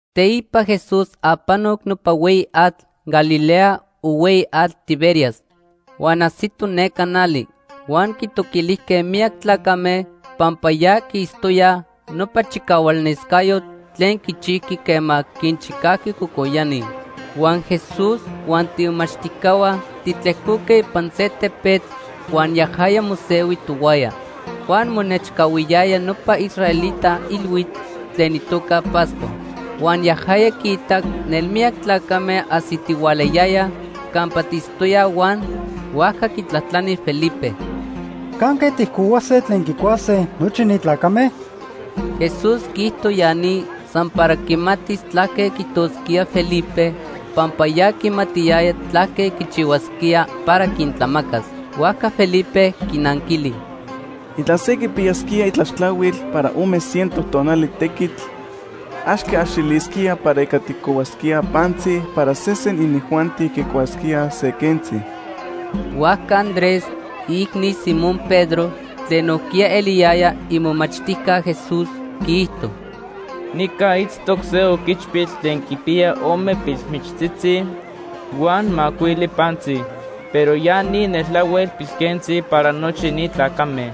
Teipa Jesús apanoc nopa Hueyi Atl Galilea o Hueyi Atl Tiberias huan ajsito neca nali. Huan quitoquilijque miyac tlacame pampa ya quiitztoyaj nopa chicahualnescayotl tlen quichijqui quema quinchicajqui cocoyani. Huan Jesús huan tiimomachtijcahua titlejcoque ipan se tepetl huan yajaya mosehui tohuaya. Huan monechcahuiyaya nopa israelita ilhuitl tlen itoca Pascua. Huan yajaya quiitac nelmiyac tlacame ajsitihualayayaj campa tiitztoyaj huan huajca quitlajtlani Felipe: ―¿Canque tijcohuase tlen quicuase nochi ni tlacame? Jesús quiijto ya ni san para quimatis tlaque quiijtosquía Felipe pampa ya quimatiyaya tlaque quichihuasquía para quintlamacas. Huajca Felipe quinanquili: ―Intla se quipiyasquía itlaxtlahuil para ome ciento tonali tequitl, ax quiaxilisquía para ica tijcohuasquíaj pantzi para sesen inijuanti quicuasquíaj se quentzi. Huajca Andrés, iicni Simón Pedro, tlen nojquiya eliyaya imomachtijca Jesús quiijto: ―Nica itztoc se oquichpil tlen quipiya ome pilmichtzitzi huan macuili pantzi, pero ya ni neltlahuel pilquentzi para nochi ni tlacame.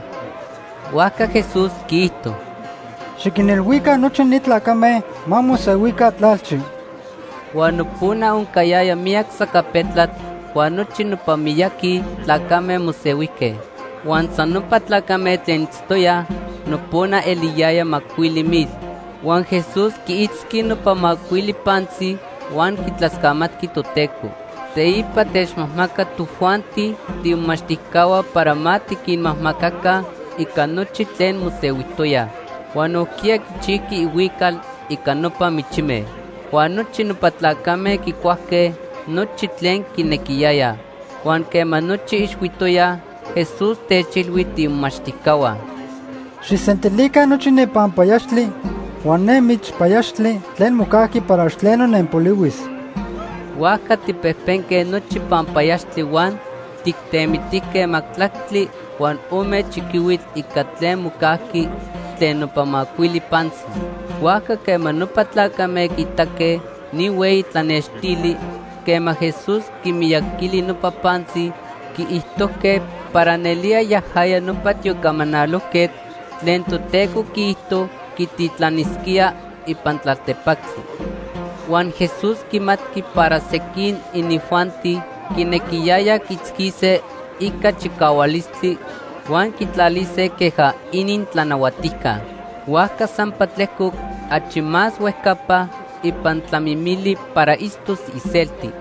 Huajca Jesús quiijto: ―Xiquinilhuica nochi ni tlacame ma mosehuica tlalchi. Huan nopona oncayaya miyac sacapetlatl huan nochi nopa miyaqui tlacame mosehuijque. Huan san nopa tlacame tlen itztoyaj nopona eliyaya macuili mil. Huan Jesús quiitzqui nopa macuili pantzi huan quitlascamatqui Toteco. Teipa techmajmacac tojuanti tiimomachtijcahua para ma tiquinmajmacaca ica nochi tlen mosehuijtoyaj. Huan nojquiya quichijqui ihuical ica nopa michime. Huan nochi nopa tlacame quicuajque nochi tlen quinequiyayaj. Huan quema nochi ixhuitoyaj, Jesús techilhui tiimomachtijcahua: ―Xijsentilica nochi ne panpayaxtli huan ne michpayaxtli tlen mocajqui para ax tleno nenpolihuis. Huajca tijpejpenque nochi panpayaxtli huan tijtemitijque majtlactli huan ome chiquihuitl ica tlen mocajqui tlen nopa macuili pantzi. Huajca quema nopa tlacame quiitaque ni hueyi tlanextili quema Jesús quimiyaquili nopa pantzi, quiijtojque para nelía yajaya nopa tiocamanalojquetl tlen Toteco quiijto quititlanisquía ipan tlaltepactli. Huan Jesús quimatqui para sequin inijuanti quinequiyayaj quiitzquise ica chicahualistli huan quitlalise queja inintlanahuatijca. Huajca sampa tlejcoc achi más huejcapa ipan tlamimili para itztos iselti.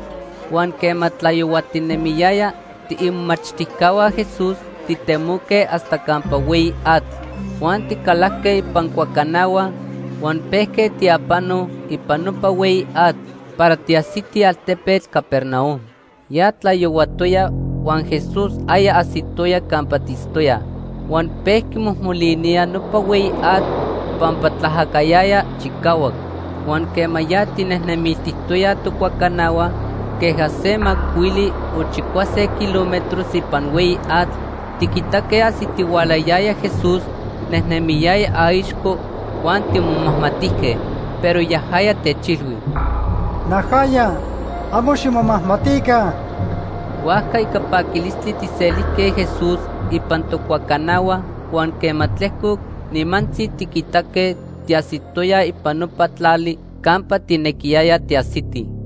Huan quema tlayohuatinemiyaya, tiimomachtijcahua Jesús titemoque hasta campa hueyi atl, huan ticalajque ipan cuacanahua huan pejque tiapano ipan nopa hueyi atl para tiajsitij altepetl Capernaum. Ya tlayohuatoya huan Jesús aya ajsitoya campa tiitztoyaj. Huan pejqui mojmolinía nopa hueyi atl pampa tlaajacayaya chicahuac. Huan quema ya tijnejnemiltijtoyaj tocuacanahua queja se macuili o chicuase kilómetros ipan hueyi atl, tiquitaque ajsitihualayaya Jesús nejnemiyaya aixco huan timomajmatijque. Pero yajaya techilhui: ―Najaya, amo ximomajmatica. Huajca ica paquilistli tijselijque Jesús ipan tocuacanahua huan quema tlejcoc, nimantzi tiquitaque tiajsitoyaj ipan nopa tlali campa tijnequiyayaj tiajsitij.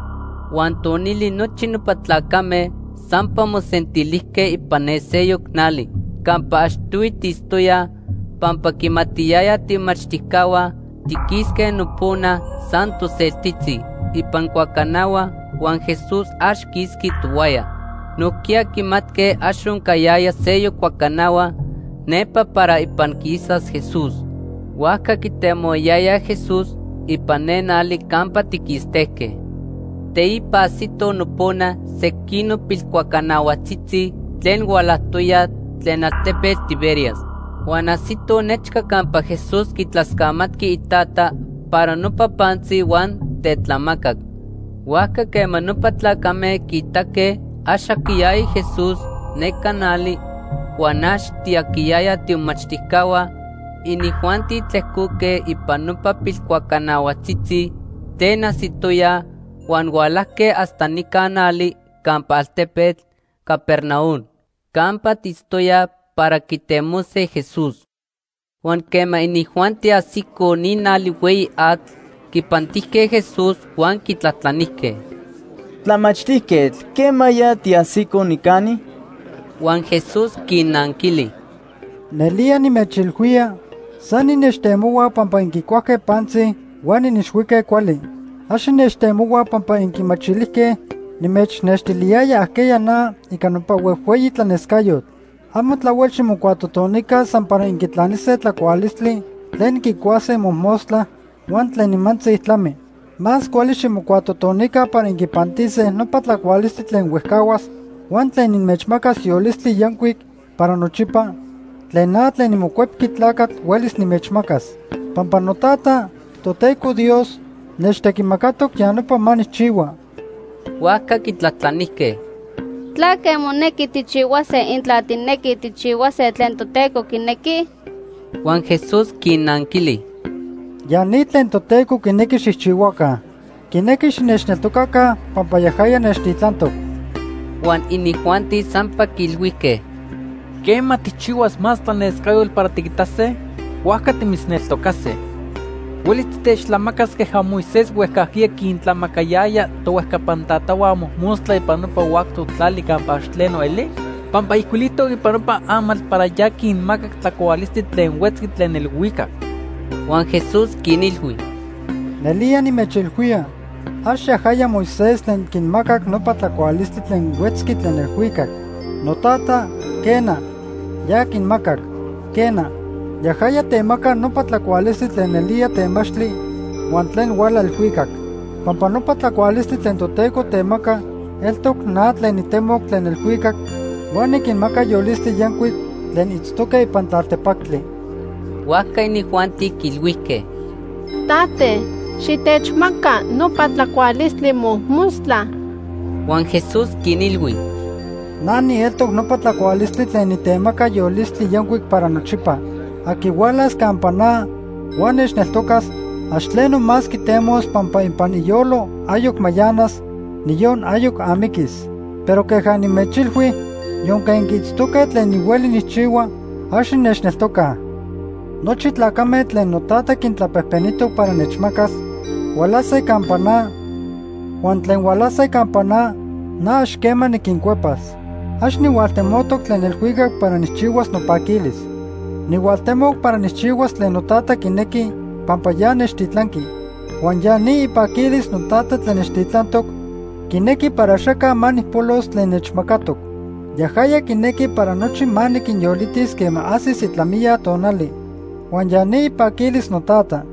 Huan tonili nochi nopa tlacame sampa mosentilijque ipan ne seyoc nali campa achtohui tiitztoyaj pampa quimatiyayaj tiimomachtijcahua tiquisque nopona san toseltitzi ipan cuacanahua huan Jesús ax quisqui tohuaya. Nojquiya quimatque ax oncayaya seyoc cuacanahua nepa para ipan quisas Jesús. Huajca quitemohuayayaj Jesús ipan ne nali campa tiquistejque. Teipa ajsitoj nopona sequinoc pilcuacanahuajtzitzi tlen hualajtoyaj tlen altepetl Tiberias. Huan ajsitoj nechca campa Jesús quitlascamatqui iTata para nopa pantzi huan tetlamacac. Huajca quema nopa tlacame quiitaque ax aquiyaya Jesús neca nali huan ax tiaquiyayaj tiimomachtijcahua, inijuanti tlejcoque ipan nopa pilcuacanahuajtzitzi tlen ajsitoyaj huan hualajque hasta nica nali campa altepetl Capernaum campa tiitztoyaj para quitemose Jesús. Huan quema inijuanti ajsicoj ni nali hueyi atl, quipantijque Jesús huan quitlajtlanijque: ―Tlamachtijquetl, ¿quemaya tiajsico nicani? Huan Jesús quinnanquili: ―Nelía nimechilhuía, san innechtemohuaj pampa inquicuajque pantzi huan inixhuique cuali. Ax innechtemohuaj pampa inquimachilijque nimechnextiliyaya ajqueya na ica nopa huejhueyi tlanescayotl. Amo tlahuel ximocuatotonica san para inquitlanise tlacualistli tlen inquicuase mojmostla huan tlen nimantzi tlami. Más cuali ximocuatotonica para inquipantise nopa tlacualistli tlen huejcahuas huan tlen inmechmacas yolistli yancuic para nochipa tlen na tlen niMocuepqui Tlacatl huelis nimechmacas. Pampa noTata, Toteco Dios, nechtequimacatoc ya nopa ma nijchihua. Huajca quitlajtlanijque: ―¿Tlaque monequi tijchihuase intla tijnequij tijchihuase tlen Toteco quinequi? Huan Jesús quinnanquili: ―Ya ni tlen Toteco quinequi xijchihuaca. Quinequi xinechneltocaca pampa yajaya nechtitlantoc. Huan inijuanti sampa quiilhuijque: ―Quema tijchihuas más tlanescayotl para tiquitase, huajca timitzneltocase. ¿Huelis titechtlamacas queja Moisés huejcajquiya quintlamacayaya tohuejcapan tatahua mojmostla ipan nopa huactoc tlali campa ax tleno eli? Pampa ijcuilijtoc ipan nopa amatl para ya quinmacac tlacualistli tlen huetzqui tlen elhuicac. Huan Jesús quinilhui: ―Nelía nimechilhuía, ax yajaya Moisés tlen quinmacac nopa tlacualistli tlen huetzqui tlen elhuicac. NoTata, quena, ya quinmacac. Quena, yajaya temaca nopa tlacualistli tlen nelía temachtli huan tlen huala elhuicac. Pampa nopa tlacualistli tlen Toteco temaca eltoc na tlen nitemoc tlen elhuicac huan niquinmaca yolistli yancuic tlen itztoque ipan tlaltepactli. Huajca inijuanti quiilhuijque: ―Tate, xitechmaca nopa tlacualistli mojmostla. Huan Jesús quinilhui: ―Na nieltoc nopa tlacualistli tlen nitemaca yolistli yancuic para nochipa. Aqui hualas campa na huan nechneltocas, ax tleno más quitemos pampa ipan iyolo ayoc mayanas, niyon ayoc amiquis. Pero queja nimechilhui, yonque inquiitztoque tlen nihueli nijchihua, ax innechneltocaj. Nochi tlacame tlen noTata quintlapejpenijtoc para nechmacas, hualase campa na, huan tlen hualase campa na, na ax quema niquincuepas. Ax nihualtemoc tlen elhuicac para nijchihuas nopaquilis. Nihualtemoc para nijchihuas tlen noTata quinequi pampa ya nechtitlanqui. Huan ya ni ipaquilis noTata tlen nechtitlantoc, quinequi para axaca ma nijpolos tlen nechmacatoc. Yajaya quinequi para nochi ma niquinyolitis quema ajsis itlamiya tonali. Huan ya ni ipaquilis noTata.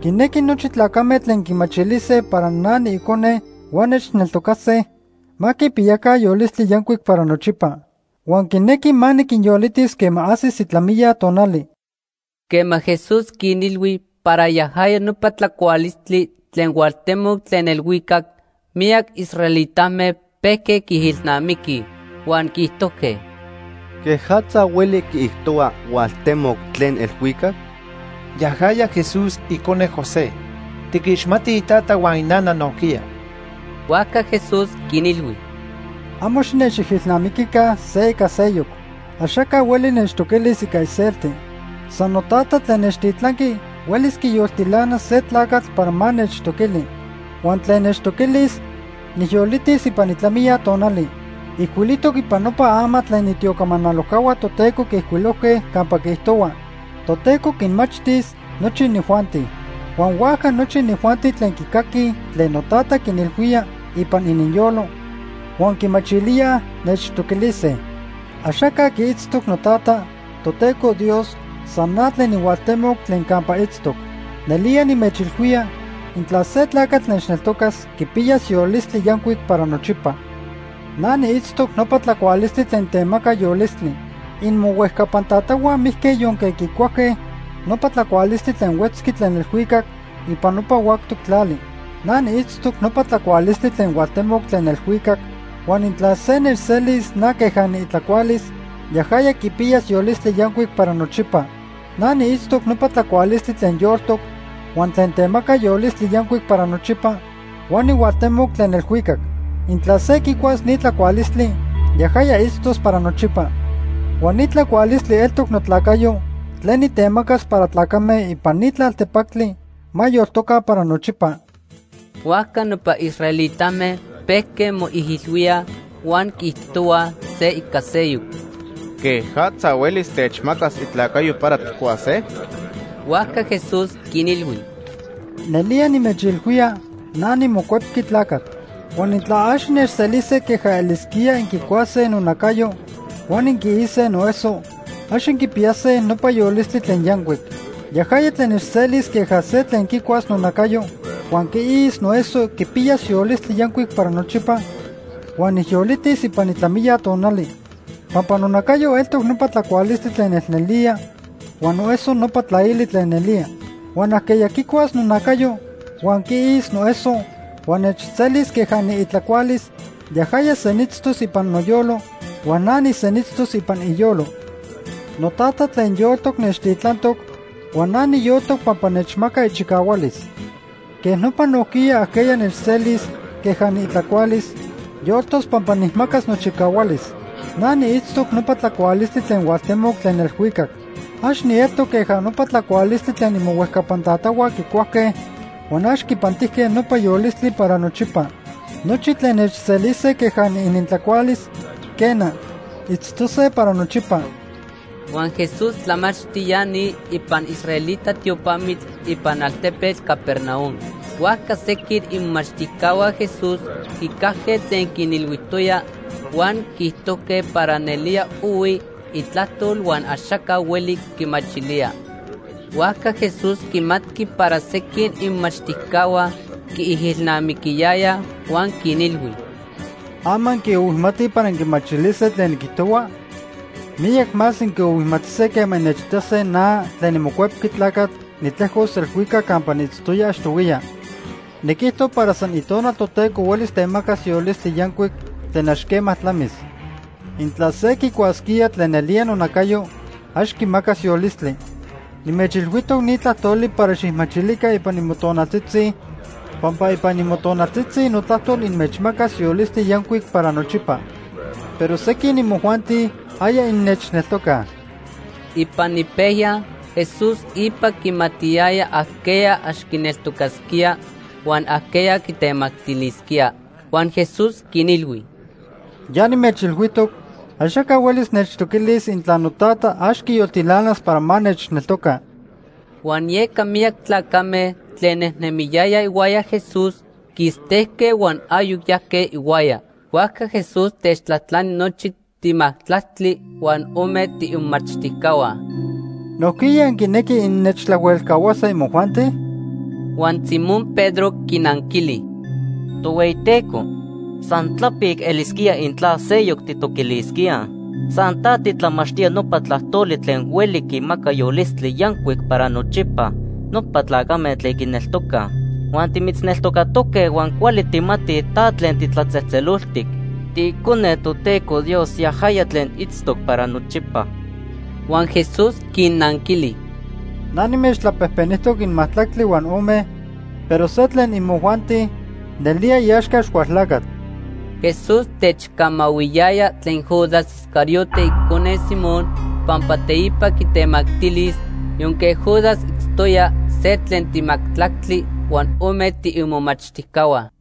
Quinequi nochi tlacame tlen quimachilise para na niIcone huan nechneltocase, ma quipiyaca yolistli yancuic para nochipa. Huan quinequi ma niquinyolitis quema ajsis itlamiya tonali. Quema Jesús quinilhui para yajaya nopa tlacualistli tlen hualtemoc tlen elhuicac, miyac israelitame pejque quiijilnamiquij, huan quiijtojque: ―¿Quejatza hueli quiijtohua hualtemoc tlen elhuicac? Yajaya Jesús, icone José. Tiquixmatij itata huan inana nojquiya. Huajca Jesús quinilhui: ―Amo xinechijilnamiquica se ica seyoc. Axaca hueli nechtoquilis ica iselti. San noTata tlen nechtitlanqui huelis quiyoltilanas se tlacatl para ma nechtoquili. Huan tlen nechtoquilis, nijyolitis ipan itlamiya tonali. Ijcuilijtoc ipan nopa amatl tlen itiocamanalojcahua Toteco quiijcuilojque campa quiijtohua: ‘Toteco quinmachtis nochi inijuanti.’ Huan huajca nochi inijuanti tlen quicaquij tlen noTata quinilhuía ipan ininyolo huan quimachilíaj, nechtoquilise. “Axaca quiitztoc noTata, Toteco Dios, san na tlen nihualtemoc tlen campa itztoc. Nelía nimechilhuía, intla se tlacatl nechneltocas, quipiyas yolistli yancuic para nochipa. Na niitztoc nopa tlacualistli tlen temaca yolistli. Inmohuejcapan tatahua mijque yonque quicuajque nopa tlacualistli tlen huetzqui tlen elhuicac ipan nopa huactoc tlali. Na niitztoc nopa tlacualistli tlen hualtemoc tlen elhuicac huan intla se nechselis na queja niitlacualis, yajaya quipiyas yolistli yancuic para nochipa. Na niitztoc nopa tlacualistli tlen yoltoc huan tlen temaca yolistli yancuic para nochipa huan nihualtemoc tlen elhuicac. Intla se quicuas ni tlacualistli, yajaya itztos para nochipa. Huan ni tlacualistli eltoc notlacayo tlen nitemacas para tlacame ipan ni tlaltepactli ma yoltojca para nochipa.” Huajca nopa israelitame pejque moijilhuíaj huan quiijtohuaj se ica seyoc: ―¿Quejatza huelis techmacas itlacayo para tijcuase? Huajca Jesús quinilhui: ―Nelía nimechilhuía na niMocuepqui Tlacatl. Huan intla ax innechselise queja elisquía inquicuase nonacayo huan inquiise noeso, ax inquipiyase nopa yolistli tlen yancuic. Yajaya tlen nechselis queja se tlen quicuas nonacayo huan quiis noeso quipiyas yolistli yancuic para nochipa huan nijyolitis ipan itlamiya tonali. Pampa nonacayo eltoc nopa tlacualistli tlen nelnelía huan noeso nopa tlaili tlen nelía. Huan ajqueya quicuas nonacayo huan quiis noeso huan nechselis queja niitlacualis, yajaya senitztos ipan noyolo huan na nisenitztos ipan iyolo. NoTata tlen yoltoc nechtitlantoc huan na niyoltoc pampa nechmaca ichicahualis. Quej nopa nojquiya ajqueya nechselis queja niitlacualis, yoltos pampa nijmacas nochicahualis. Na niitztoc nopa tlacualistli tlen hualtemoc tlen elhuicac. Ax nieltoc queja nopa tlacualistli tlen imohuejcapan tatahua quicuajque huan ax quipantijque nopa yolistli para nochipa. Nochi tlen nechselise queja niinintlacualis, quena, itztose para nochipa. Huan Jesús tlamachti ya ni ipan israelita tiopamitl ipan altepetl Capernaum. Huajca sequin imomachtijcahua Jesús quicajque tlen quinilhuijtoya, huan quiijtojque para nelía ohui itlajtol huan axaca hueli quimachilía. Huajca Jesús quimatqui para sequin imomachtijcahua quiijilnamiquiyayaj huan quinilhui: ―¿Ama inquiohuimatij para inquimachilise tlen niquijtohua? Miyac más inquiohuimatise quema innechitase na, tlen niMocuepqui Tlacatl, nitlejcos elhuicac campa niitztoya achtohuiya. Niquijto para san Itonal Toteco huelis temacas yolistli yancuic tlen ax quema tlamis. Intla se quicuasquía tlen nelía nonacayo, ax quimacas yolistli. Nimechilhuijtoc ni tlajtoli para xijmachilica ipan imotonaltzitzi pampa ipan imotonaltzitzi notlajtol inmechmacas yolistli yancuic para nochipa. Pero sequin imojuanti aya innechneltocaj. Ipan ipejya Jesús ipa quimatiyaya ajqueya ax quineltocasquía huan ajqueya quitemactilisquía. Huan Jesús quinilhui: ―Ya nimechilhuijtoc axaca huelis nechtoquilis intla noTata ax quiyoltilanas para ma nechneltoca. Huan yeca miyac tlacame tlen nejnemiyayaj ihuaya Jesús quistejque huan ayoc yajque ihuaya. Huajca Jesús techtlajtlani nochi timajtlactli huan ome tiimomachtijcahua: ―¿Nojquiya inquinequij innechtlahuelcahuase imojuanti? Huan Simón Pedro quinanquili: ―Tohueyiteco, san tlapic elisquía intla seyoc tijtoquilisquíaj. San ta titlamachtía nopa tlajtoli tlen hueli quinmaca yolistli yancuic para nochipa nopa tlacame tlen quineltocaj. Huan timitzneltocatoque huan cuali tijmatij ta tlen titlatzejtzeloltic. TiIcone Toteco Dios, yajaya tlen itztoc para nochipa. Huan Jesús quinnanquili: ―Na nimechtlapejpenijtoc inmajtlactli huan ome, pero se tlen imojuanti nelía iaxca Axcualtlacatl. Jesús techcamahuiyaya tlen Judas Iscariote icone Simón pampa teipa quitemactilis yonque Judas itztoya se tlen timajtlactli huan ome tiimomachtijcahua.